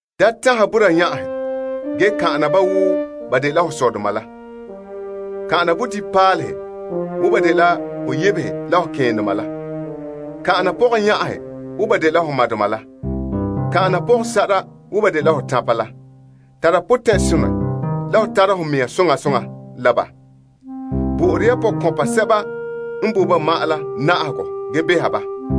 Da tanha boraa yan'ahe ge kan'ana ba wo ba dela ho sɔdoma la. Kan'ana bodibinpaalehe wo ba dela ho yebehe la ho keendoma la. Kan'ana pɔgɔyan'ahe wo ba dela ho madoma la. Kan'ana pɔgɔsa'ara wo ba dela ho tanpa la potɛn'ɛrɛ n ka tare dɛngerɔ. Bo'ore ya pɔkɔnpa sɛba n boe ba ma'an la na'ahegɔ ge beha ba.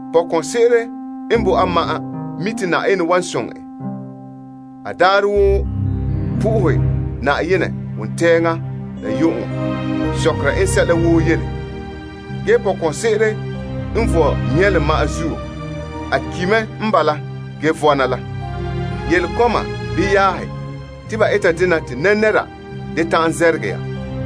Pɔkɔnse'ere n boe a ma'an mi' te Yenɛ wan soŋɛ en, a daarɛ woo po'ohɛ Yenɛ wontɛɛŋa la yu'uŋɔ sɔkera en sɛla woo yele. Ge pɔkɔnse'ere n vɔe nyɛlom ma'an zuo, a ki' mɛ n bala ge vɔna la. Yele kɔma bii yaahe te ba eta dena te nɛra da ta'an zɛrɛgɛ ya.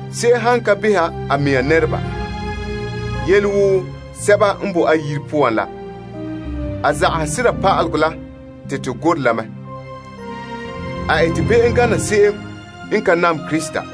Se'em han ka beha a mɛŋa nɛreba, yele woo sɛba n boe a yire poan la, a zagahe sera pa'alegɔ la te to gorɛ la mɛ. A ete be'em gana se'em n ka nam Krista.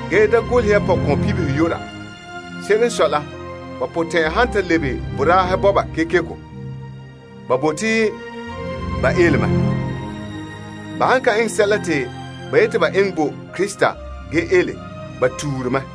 Da golehɛ ya pɔkɔnbibihe yu'ura. Se'ere n sɔe la, ba potɛn'ɛra han ta lebe boraahe bɔba kekeko, ba bote te ba ele, ba ne zagahɛ Krista. Ba han ka eŋɛ sɛla te ba yeti ba eŋɛ bo Krista ge ele, ba tuure mɛ.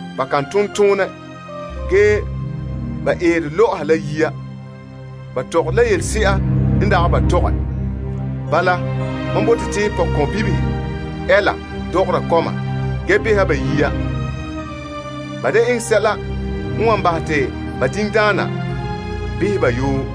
Ba kan ton toonɛ ge ba eere lɔ'ɔha la yiya. Ba zamehe la yelebibihe tɔgɔre la yelese'a n dagɛ ba tɔgɛ. Bala, mam bote te pɔkɔnbibihe ɛɛla dɔgɔra kɔma ge beha ba yiya. Ba da eŋɛ sɛla n wan bahɛ te to diŋdoma beha to yoo.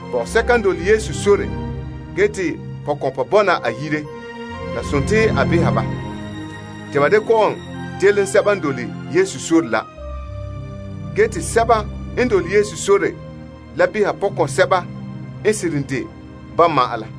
Pɔgɔsɛka n dole Yesu sore ge te pɔkɔnpa bɔna a yire, la dela a beha ba. Te ba da kɔ'ɔn delom lagaŋɔ la, ge te lagaŋɔ la nyaŋɛ behera pɔkɔnsɛba n seren de ba ma'an la.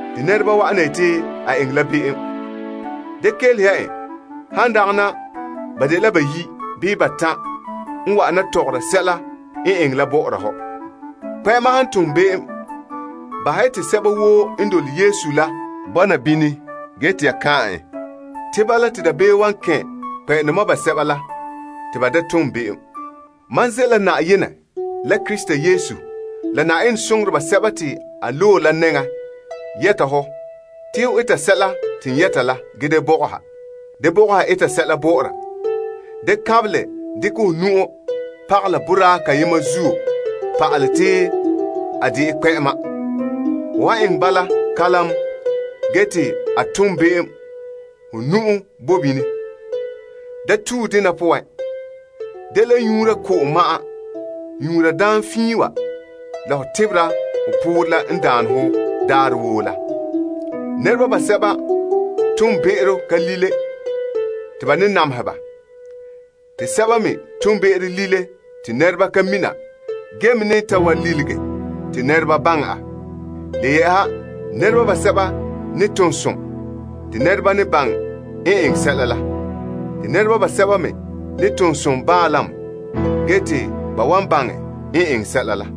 Nɛra wa'ana yeti kpɛ'ɛma eŋɛ la be'em, da kelehe en, han dagana ba dela bayi' bii batan' n wa'ana tɔgɔra sɛla en eŋɛ la. Kpɛ'ɛma han tom be'em, bahɛ ya te sɛba woo n dole Yesu la bɔna bini ge te ya kan'an en, te bala te dabeem wan kɛn' kpɛ'ɛndoma basɛba la te ba da tom be'em. Mam ze' la Yenɛ la Krista Yesu la Yenɛ soŋoreba sɛba te a loe la nɛŋan yɛta hɔ te ho eta sɛla te n yɛta la ge da bɔgɔha eta sɛla bɔ'ɔra. Da kanbelɛ dekɛ ho nu'o pagalɛ boraa kayema zuo pa'alɛ te a dɛna kpɛ'ɛma. Ho han eŋɛ bala kalam ge te a tom be'em ho nu'o boe bini. Da le nyuura ko'om ma'an. Nyuura daam fiin wa la ho tebera ho poorɛ la n daane ho daarɛ woo la. Nɛreba basɛba toonbe'ero ka lile te ba ne namehe ba. Te basɛba me toonbe'ero lile te nɛreba ka mina ge la wan lilige te nɛreba baŋɛ. Le yɛ'ɛha, nɛreba basɛba ne tom som te nɛreba ne baŋɛ n eŋɛ sɛla, te nɛreba basɛba me ne tom som baanlam ge te ba ne ta baŋɛ n eŋɛ sɛla la.